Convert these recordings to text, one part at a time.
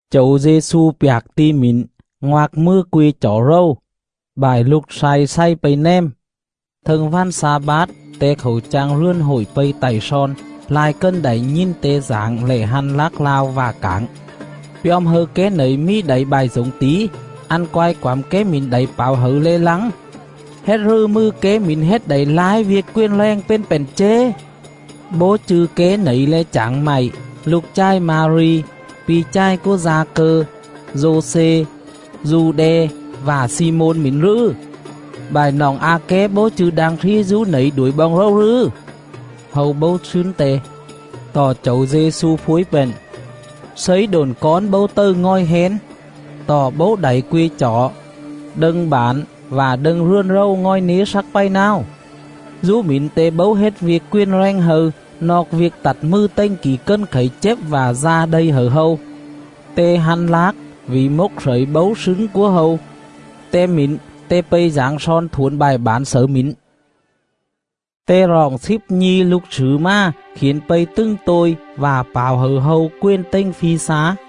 Chẩu Dê-xu pjạc ti̱ mỉn, ngoạc mừa que chỏ rầu; bại lục slay xày pây nèm. Thâng vằn xa-bát, Te khảu chang rườn hội pây tạy slon. Lai cần đảy nhìn Te dảng lẻ hăn lác lao vạ cảng: “Pjom hâư ké nẩy mì đảy bại dổng tỉ? Ăn quai quẳm ké mỉn đảy pảo hẩư le̱ lăng? Hết rừ mừ ké mỉn hết đảy lai viêc quền rèng pền pện chế? Bố chư̱ ké nẩy le̱ chảng mạy, lục chài Ma-ri, pi̱ chài cúa Da-cơ, Dô-xê, Du-đe, vạ Xi-môn mỉn rừ? Bại noọng a ké bố chư̱ đang slí dú nẩy đuổi boong rầu rừ?” Hâu bấu slứn Te. Tọ Chẩu Dê-xu phuối pện: “Slấy độn cón bấu tầư ngòi hén, tọ bấu đảy que chỏ, đâng bản vạ đâng rườn rầu ngòi nế slắc pày náo.”. Dú mỉn Te bấu hết viêc quền rèng hâư noọc viêc tặt mừ tềnh kỉ cần khẩy chếp vạ da đây hẩư hâu. Te hăn lác vỉ mốc slẩy bấu slứn cúa hâu. Tem mỉn, Te pây dảng slon thuổn bại bản xẩư mỉn. Te roọng slíp nhi̱ lục slử mà, khiển pây tứng tôi, vạ pảo hẩư hâu quền tềnh phi slá.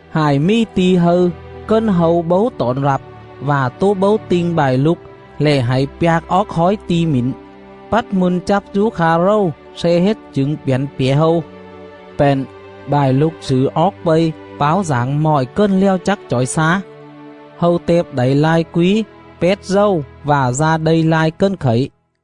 Hại mì ti̱ hâư cần hâu bấu tỏn rặp vạ tố bấu ti̱nh bại lục lẻ hạy pjạc oóc khói ti̱ mỉn, pắt mư̱n chắp dú kha rầu sle hết chửng pjẳn pjẻ hâu.”. Pện, bại lục slử oóc pây, páo dảng mọi cần lèo chắc chỏi xá. Hâu tẹp đảy lai quí, pét dầu vạ da đây lai cần khẩy..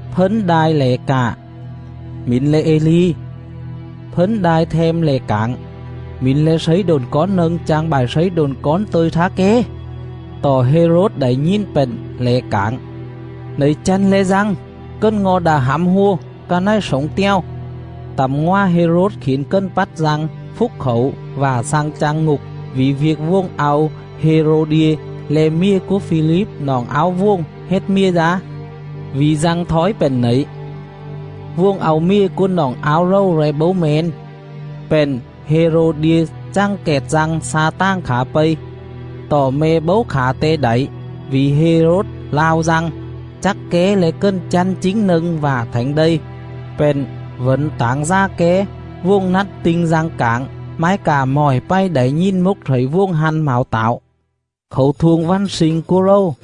Fấn đai lẻ cạ: “Mỉn le̱ Ê-li.” Fấn đai them lẻ cảng: “Mỉn le̱ slấy độn cón nâng chang bại slấy độn cón tơ̱i thá ké.” Tọ Hê-rốt đảy nhìn pện lẻ cảng: “Nẩy chăn le̱ Dăng, cần ngo̱ đạ hẳm hua, ca này slổng te̱o.” Tẳm ngòa Hê-rốt khiển cần pắt Dăng, phúc khảu vạ xăng chang ngục vỉ viêc vuồng au Hê-rô-đia, le̱ mjề cúa Phi-líp noọng áo vuồng, hết mjề dá.. Vỉ Dăng thói pện nẩy: “Vuồng au mjề cúa noọng áo rầu le̱ bấu me̱n” pện Hê-rô-đia chằng kẹt Dăng xa tàng khả pây. Tọ me̱ bấu khả te đảy, vỉ Hê-rốt lao Dăng, chắc ké le̱ cần chăn chính nâng vạ thảnh đây, pện vẩn tảng dà ké. Vuồng nắt ti̱nh Dăng cảng, mái cạ mọi pày đảy nhìn mốc slẩy vuồng hăn mảo tảo. Khảu thuông vằn sling cúa rầu,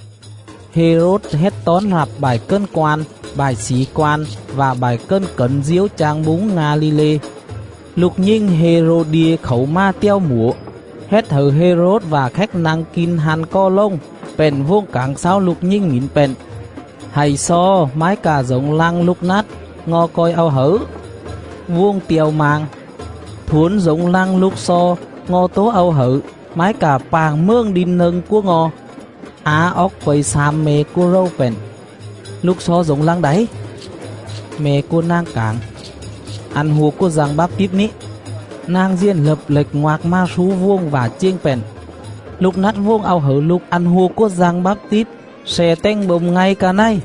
Hê-rốt hết tón rặp bại cần quan, bại xỉ quan, vạ bại cần cẩn diếu chang búng Nga-li-lê. Lục nhình Hê-rô-đia khảu mà tèo mủa, hết hẩư Hê-rốt vạ khéc nă̱ng kin hăn cò lồng, pện vuồng cảng xáu lục nhình mỉn pện: “Hạy xo mái cạ dổng lăng lục nắt, ngo̱ co̱i au hẩư.” Vuồng te̱o mang: “Thuổn dổng lăng lục xo, ngo̱ tố au hẩư, mái cạ pạng mường đin nâng cúa ngo̱.” Á oóc pây xam me̱ cúa rầu pện: “Lục xo dổng lăng đảy?” Me̱ cúa nàng cảng: “Ăn hua cúa Dăng Báp-tít ní.” Nàng diền lập lệch ngoạc mà slú vuồng vạ chiềng pện: “Lục nắt vuồng au hẩư lục ăn hua cúa Dăng Báp-tít sle tềnh bôm ngay ca này.”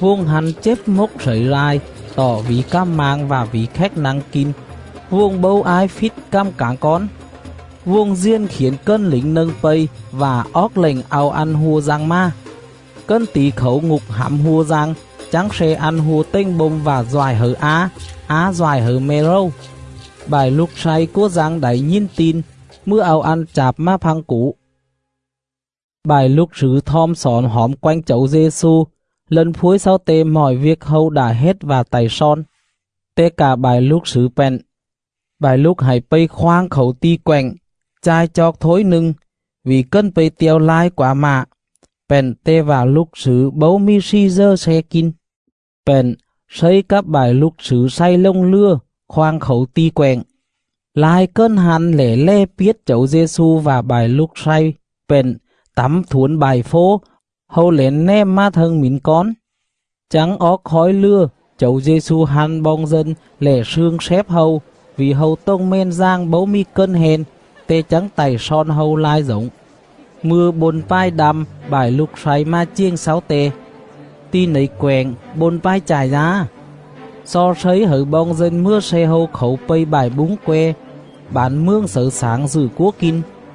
Vuồng hăn chếp mốc slẩy lai; tọ vỉ cằm mang vạ vỉ khéc nă̱ng kin, vuồng bấu ái phít cằm cảng cón. Vuồng diền khiển cần lỉnh nâng pây vạ oóc lệnh au ăn hua Dăng mà. Cần tỉ khảu ngục hẳm hua Dăng, chắng sle ăn hua tềnh bôm vạ doại hẩư á. Á doại hẩư me̱ rầu. Bại lục slay cúa Dăng đảy nhìn tin, mừa au ăn chạp mà phăng củ. Bại lục slử thom xỏn hỏm quenh Chẩu Dê-xu, lân phuối xáu Te mọi viêc hâu đạ hết vạ tạy slon. Te cạ bại lục slử pện: “Bại lục hạy pây khoang khảu ti̱ quẹng, cha̱i chooc thối nâng.” Vỉ cần pây te̱o lai quá mạ, pện Te vạ lục slử bấu mì slì dờ sle kin. Pện, Slấy cắp bại lục slử xày lồng lừa khoang khảu ti̱ quẹng. Lai cần hăn lẻ lè piết Chẩu Dê-xu vạ bại lục slay pện tẳm thuổn bại fố, hâu lẻn nèm mà thâng mỉn cón. Chắng oóc khói lừa, Chẩu Dê-xu hăn boong dân lẻ slương slép hâu, vỉ hâu tồng mèn dàng bấu mì cần hen. Te chắng tạy slon hâu lai dổng.. Mư̱a bôn pài đăm, bại lục slay mà chiềng xáu Te: “Ti nẩy quẹng bôn pài chại dá; xo Slấy hẩư boong dân mừa sle hâu khảu pây bại búng que, bản mường xẩư xảng dự cúa kin.”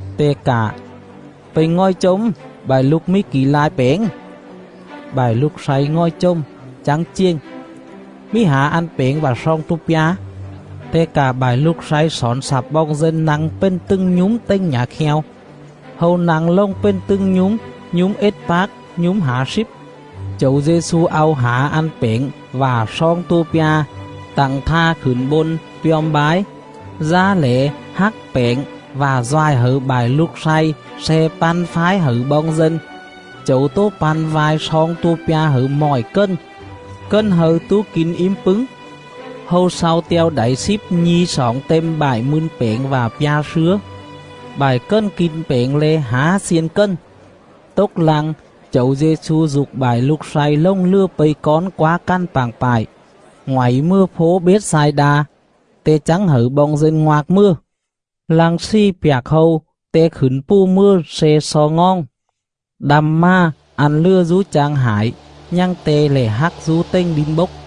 Te cạ: “Pây ngòi chồm bại lục mì kỉ lai pẻng?” Bại lục slay ngòi chồm, chắng chiềng: “Mì hả ăn pẻng vạ sloong tua pja.” Te cạ bại lục slay xỏn xặp boong dân nă̱ng pền tứng nhúm tềnh nhả kheo. Hâu nă̱ng lồng pền tứng nhúm, nhúm ết pác, nhúm hả slíp. Chẩu Dê-xu au hả ăn pẻng vạ sloong tua pja, tẳng tha khửn bôn pjom bái, dá lẻ hắc pẻng vạ doại hẩư bại lục slay sle păn phái hẩư boong dân. Chẩu tố păn vai sloong tua pja hẩư mọi cần. Cần hâư tố kin ím pứng. Hâu slau te̱o đảy slíp nhi̱ xoỏng têm bại mư̱n pẻng vạ pja slứa. Bại cần kin pẻng le̱ hả xiên cần. Tốc lăng, Chẩu Dê-xu dục bại lục slay lồng lừa pây cón quá cằn pạng pại, ngoảy mừa fố Bết-xai-đa, Te chắng hẩư boong dân ngoạc mừa. Lăng slì pjạc hâu, Te khửn pù mừa sle xo ngoòng. Đăm mà, ăn lừa dú chang hải, nhằng Te lẻ hác dú tềnh đin bốc.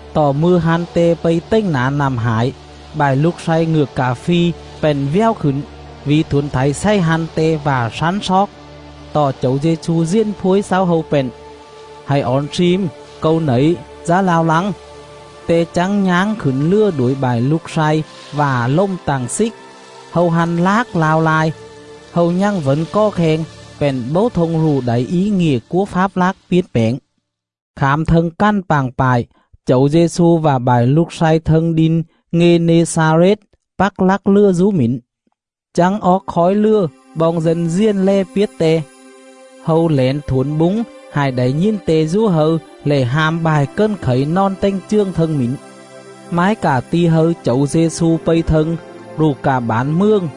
Tọ mư̱a hăn Te pây tềnh nả nặm hải, bại lục slay ngựa cạ phi pện vèo khửn, vỉ thuổn thảy xày hăn Te vạ slắn sloóc. Tọ Chẩu Dê-xu diền phuối xáu hâu pện: “Hạy ỏn slim, Câu nẩy, dá lao lăng!” Te chắng nháng khửn lừa đuổi bại lục slay, vạ lồm tặng xích. Hâu hăn lác lao lai, hâu nhằng vẩn cò kheng, pện bấu thông rụ đảy í ngịa cúa fáp lác piến pẻng. Khảm thâng cằn pạng pại, Chẩu Dê-xu vạ bại lục slay thâng đin Ngê-nê-xa-rết, pắc lắc lừa dú mỉn. Chắng oóc khói lừa, boong dân diền lè piết Te. Hâu lẻn thuổn búng, hại đảy nhìn Te dú hâư lẻ ham bại cần khẩy nòn tềnh chường thâng mỉn. Mái cạ ti̱ hâư Chẩu Dê-xu pây thâng, rụ cạ bản mường,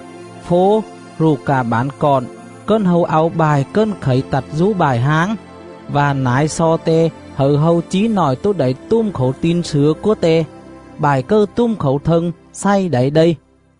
fố rụ cạ bản cọn, cần hâu au bại cần khẩy tặt dú bại háng, vạ nải xo Te hẩư hâu chí nọi tố đảy tùm khảu tin slửa cúa Te; bại cầư tùm khảu thâng xày đảy đây.